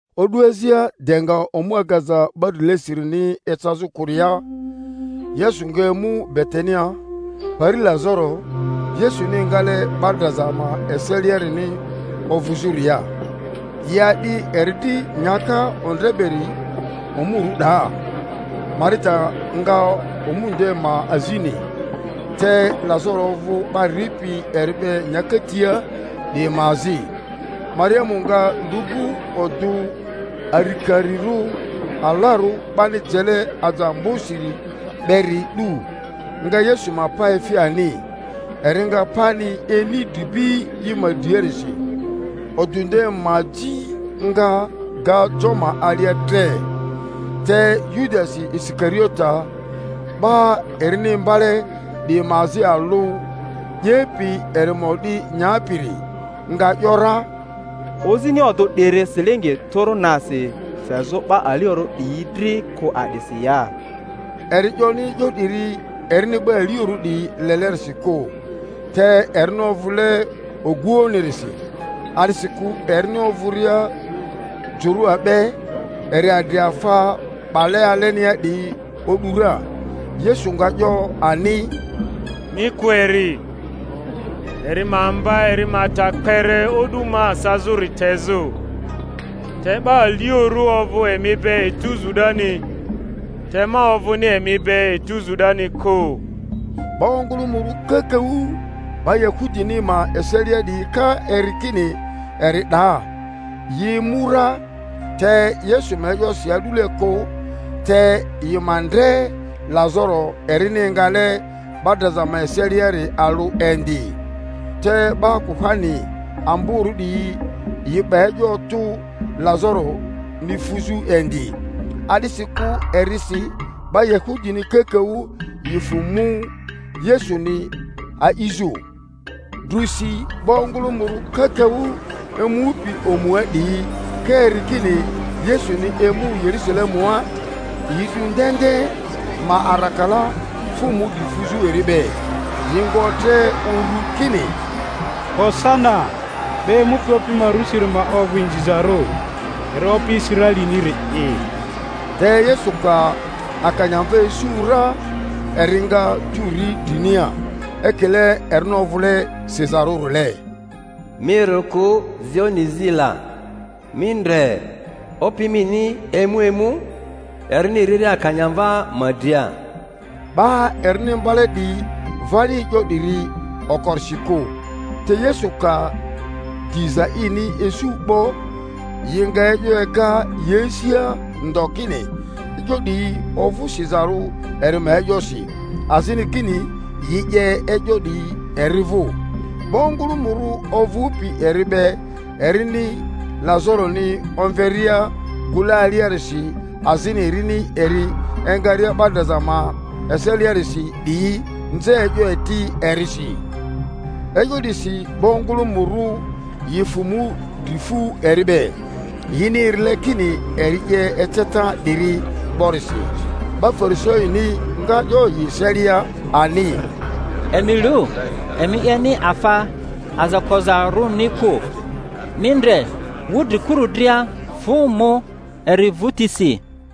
O'du azia de nga omu agaza 'ba drilesirini ecazᴜ kᴜria, Yesu nga emu Betania, pari Lazaro Yesuni engale 'ba draza ma eseliarini ovᴜzᴜria. Yi a'di eri dri nyaka ondre beri omurᴜ 'daa; Marita nga omu nde ma azini, te Lazaro ovᴜ 'ba ripi eri be nyaka tia 'diyi ma azi. Mariamu nga lu'bu odᴜ arikarirᴜ alarᴜ 'bani jele aje ambosiri beri 'du, nga Yesu ma pa efi ani, eri nga pani ini dribi i ma driarisi; odᴜ nde ma aji nga ga jo ma alia tre. Te Yudasi Isikariote, 'ba erini imbale 'diyi ma azi alᴜ ('yepi eri ma o'di nyapiri) nga ‘yora, Ozini odᴜ 'diri silingi tᴜrᴜ nasi fezᴜ 'ba aliorᴜ 'diyi dri kᴜ a'disi ya? Eri 'yoni e'yo 'diri erini 'ba aliorᴜ 'diyi lelerisi kᴜ, te erini ovᴜle oguoᴜnirisi, a'disikᴜ erini ovᴜria jᴜrᴜa be, eri adri afa 'bale alenia 'diyi o'du ra. Yesu nga 'yo ani, Mi kᴜ eri, eri ma mba eri ma ta kpere o'du ma sazᴜri tezᴜ. Te 'ba aliorᴜ ovᴜ emi be etuzu 'dani, te ma ovᴜni emi be etuzu 'dani kᴜ. 'Ba ongᴜlᴜmᴜrᴜ kakaᴜ 'ba Yahudini ma eselia 'diyi ka eri kini eri 'daa, yi emu ra, te Yesu ma e'yosi a'dule kᴜ, te yi ma ndre Lazaro erini engale 'ba draza ma eseliari alᴜ indi. Te 'ba kuhani amborᴜ 'diyi yi 'ba e'yo otᴜ Lazaroni fuzᴜ indi, a'disikᴜ erisi 'ba Yahudini kakaᴜ yi fᴜ mu Yesuni a'izᴜ. Drusi 'ba ongᴜlᴜmᴜrᴜ kakaᴜ emupi omua 'diyi ka eri kini Yesuni emu Yerᴜsalemua, yi 'du ndende ma arakala, fᴜ mu dri fuzᴜ eri be, yi nga otre uru kini, Hosana! 'Ba emupi Opi ma rusiri ma ovᴜ inzizarᴜ, eri Opi Israeliniri'i! Te Yesu ka akanyamva isu ra. eri nga tu ri drinia; ekile erini ovᴜle sizarᴜrile, Mi rᴜ kᴜ, Zioni zi la; mi ndre, Opi mini emu emu erini riria akanyamva ma dria! 'Ba erini imbale 'diyi vani e'yo 'diri okorisi kᴜ; te Yesu ka diza ini isu 'bo, yi nga e'yo ega yi asia ndo kini e'yo 'diyi ovᴜ sizarᴜ eri ma e'yosi, azini kini yi 'ye e'yo 'diyi eri vᴜ. 'Ba ongᴜlᴜmᴜrᴜ ovᴜpi eri be erini Lazaroni omveria gᴜle aliarisi, azini erini eri engaria 'ba draza ma eseliarisi 'diyi nze e'yo eti erisi. E'yo 'disi 'ba ongᴜlᴜmᴜrᴜ yi fᴜ mu dri fu eri be, yini erile kini eri 'ye eceta 'diri 'borisi. 'Ba Farisaini nga 'yo yi eselia ani, Emi lu, emi 'yeni afa aza kozarᴜni kᴜ; mi ndre, wudrikuru dria fᴜ mu eri vᴜtisi.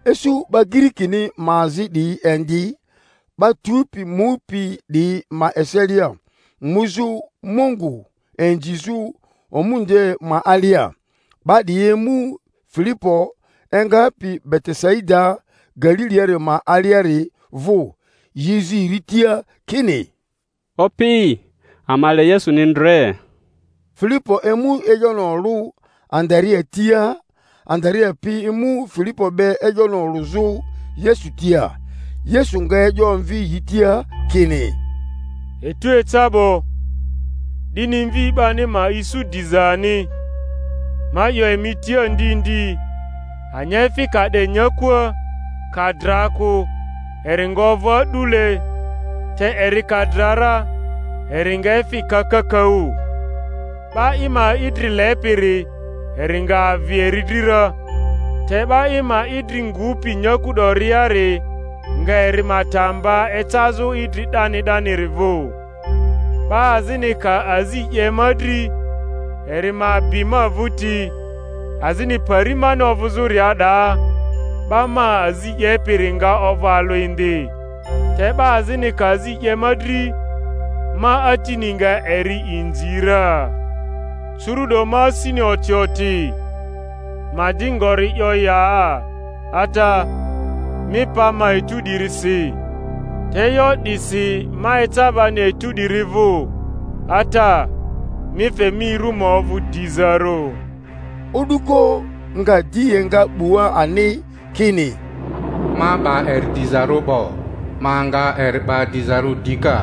Isu 'ba Girikini ma azi 'diyi indi 'ba tupi mupi 'diyi ma eselia, muzᴜ Mungu inzizᴜ omu nde ma alia. 'Ba 'diyi emu Filipo engapi Betesaida Galiliari ma aliari vᴜ, yi zi eri tia kini, Opi, ama le Yesuni ndre. Filipo emu e'yoni olᴜ Andarea tia; Andarea pi emu Filipo be e'yoni olᴜzᴜ Yesu tia. Yesu nga e'yo omvi yi tia kini, Etu eca 'bo, 'dini Mvi 'bani ma isu diza ani. Ma 'yo emi tia ndi ndi, anyaefi ka 'de nyakua, ka dra kᴜ, eri nga ovᴜ a'dule; te eri ka dra ra, eri nga efi ka kakaᴜ. 'Ba i ma idri lepiri, eri nga avi eri dri ra, te 'ba i ma idri ngupi nyaku 'doriari nga eri ma ta mba ecazᴜ idri 'dani 'daniri vᴜ. 'Ba azini ka azi 'ye ma dri, eri ma bi ma vᴜti; azini pari mani ovᴜzᴜria, 'daa 'ba ma azi 'yepiri nga ovᴜ alᴜ indi; te 'ba azini ka azi 'ye ma dri, ma Atini nga eri inzi ra. Curu'do ma asini oti oti; ma di ngori 'yo ya? Ata, mi pa ma etu 'dirisi. Te e'yo 'disi ma eca bani etu 'diri vᴜ. Ata, mi fe mi ru ma ovᴜ dizarᴜ. O'duko nga di enga 'bua ani, kini, Ma 'ba eri dizarᴜ 'bo, ma nga eri 'ba dizarᴜ dika.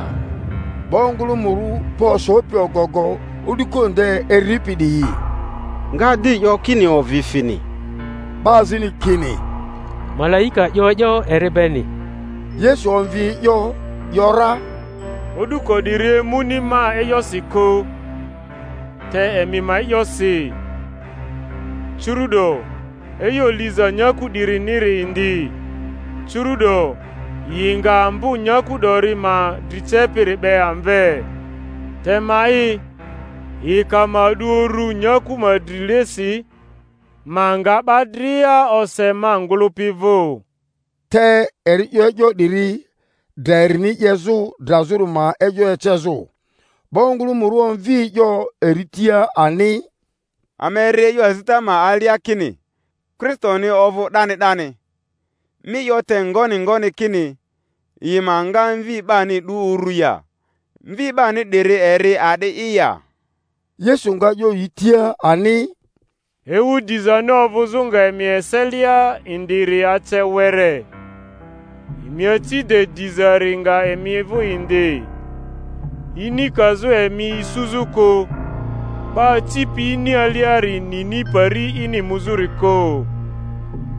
'Ba ongᴜlᴜmᴜrᴜ pa osopi ogogo, o'duko nde eripi 'diyi, nga di 'yo kini ovi fini. 'Ba azini kini, Malaika 'yo e'yo eri beni. Yesu omvi e'yo ‘yora, O'duko 'diri emuni ma e'yosi kᴜ, te emi ma e'yosi. Curu'do e'yo liza nyaku 'diriniri indi, curu'do yi nga ambo nyaku 'dori ma dri cepiri 'be amve. Te ma'i, yi ka ma 'du uru nyaku ma drilesi, ma nga 'ba dria ose ma ngᴜlᴜpi vᴜ. Te eri 'yo e'yo 'diri, dra erini 'yezᴜ drazᴜri ma e'yo ecezᴜ. 'Ba ongᴜlᴜmᴜrᴜ omvi e'yo eri tia ani, Ama eri e'yo azita ma alia kini Kristoni ovᴜ 'dani 'dani. Mi 'yo te ngoni ngoni kini yi ma nga Mvi 'bani 'du uru ya? Mvi 'bani 'diri eri a'di'i ya? Yesu nga 'yo yi tia ani, Ewu dizani ovᴜzᴜ nga emi eselia indiri ace were. Emi aci de dizari nga emi vᴜ indi, ini kazᴜ emi isuzᴜ kᴜ; 'ba acipi ini aliari nini pari ini muzᴜri kᴜ.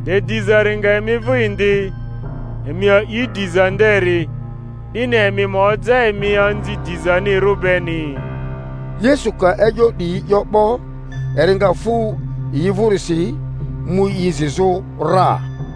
De dizari nga emi vᴜ indi, emi a'i diza nderi, 'dini emi ma oja emi anzi dizanirᴜ beni. Yesu ka e'yo 'diyi 'yo 'bo, eri nga fᴜ yi vᴜrisi, mu i zizᴜ ra.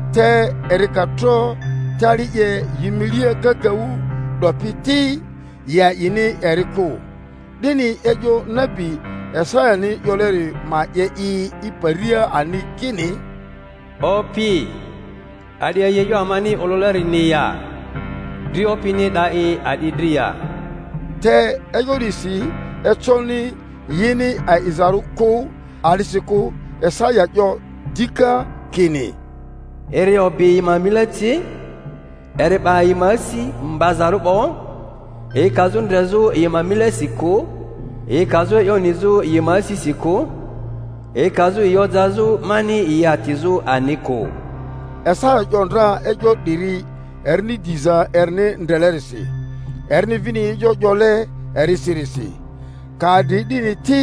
Te eri ka tro tali 'ye yi milia kakaᴜ 'dopi ti, yi a'ini eri kᴜ; 'dini e'yo nabi Isayani 'yoleri ma 'ye i i paria ani, kini: Opi, a'di a'i e'yo amani olᴜlerini ya? Dri Opini e'da i a'di dri ya? Te e'yo 'disi econi yini a'izarᴜ kᴜ, a'disikᴜ Isaya 'yo dika kini, Eri obi yi ma mile ci, eri 'ba yi ma asi mbazarᴜ 'bo, yi kazᴜ ndrezᴜ yi ma milesi kᴜ, yi kazᴜ e'yo nizᴜ yi ma asisi kᴜ, yi kazᴜ yi ojazᴜ mani yi atizᴜ ani kᴜ. Isaya 'yo ndra e'yo 'diri erini diza erini ndrelerisi, erini vini e'yo 'yole erisirisi. Ka adri 'dini ti,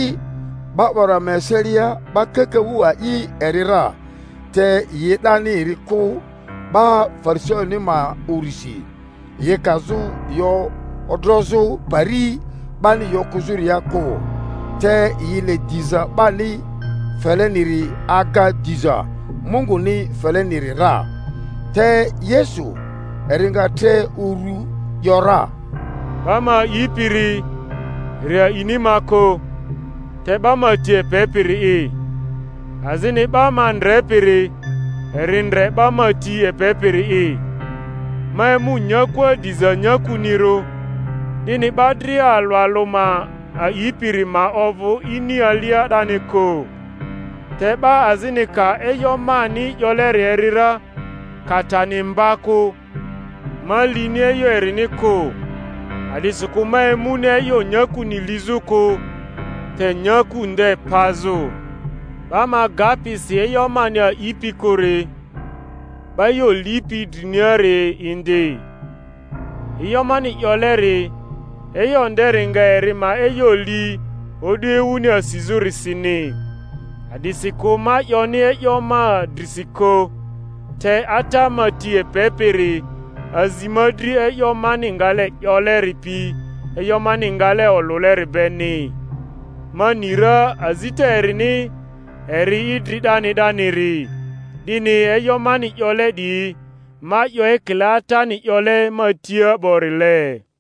'ba 'wara ma eselia 'ba kakaᴜ a'i eri ra, te yi e'dani eri kᴜ 'ba Farisaini ma urisi, yi kazᴜ yi odrozᴜ pari 'bani yi okᴜzᴜria kᴜ: te yi le diza 'bani feleniri aga diza Munguni feleniri ra. Te Yesu eri nga tre uru ‘yora, Ba ma a'ipiri, eri a'ini ma kᴜ, te 'ba ma ti epepiri'i. Azini 'ba ma ndrepiri eri ndre 'ba ma ti epepiri'i. Ma emu nyakua diza nyakunirᴜ, 'dini 'ba dria alᴜ alᴜ ma a'ipiri ma ovᴜ ini alia 'dani kᴜ. Te 'ba azini ka e'yo mani 'yoleri eri ra, ka tani mba kᴜ, ma lini e'yo erini kᴜ; a'disikᴜ ma emuni e'yo nyakuni lizᴜ kᴜ, te nyaku nde pazᴜ. 'Ba ma gapi si e'yo mani a'ipi kᴜri, 'ba e'yo lipi driniari indi; e'yo mani 'yoleri, e'yo nderi nga eri ma e'yo li o'du ewuni asizᴜrisini. A'disikᴜ ma 'yoni e'yo ma drisi kᴜ; te Ata ma ti epepiri azi ma dri e'yo mani ngale 'yoleri pi e'yo mani ngale olᴜleri beni. Ma ni ra azita erini eri idri 'dani 'daniri. 'Dini e'yo mani 'yole 'diyi, ma 'yo ekile Atani 'yole ma tia 'borile.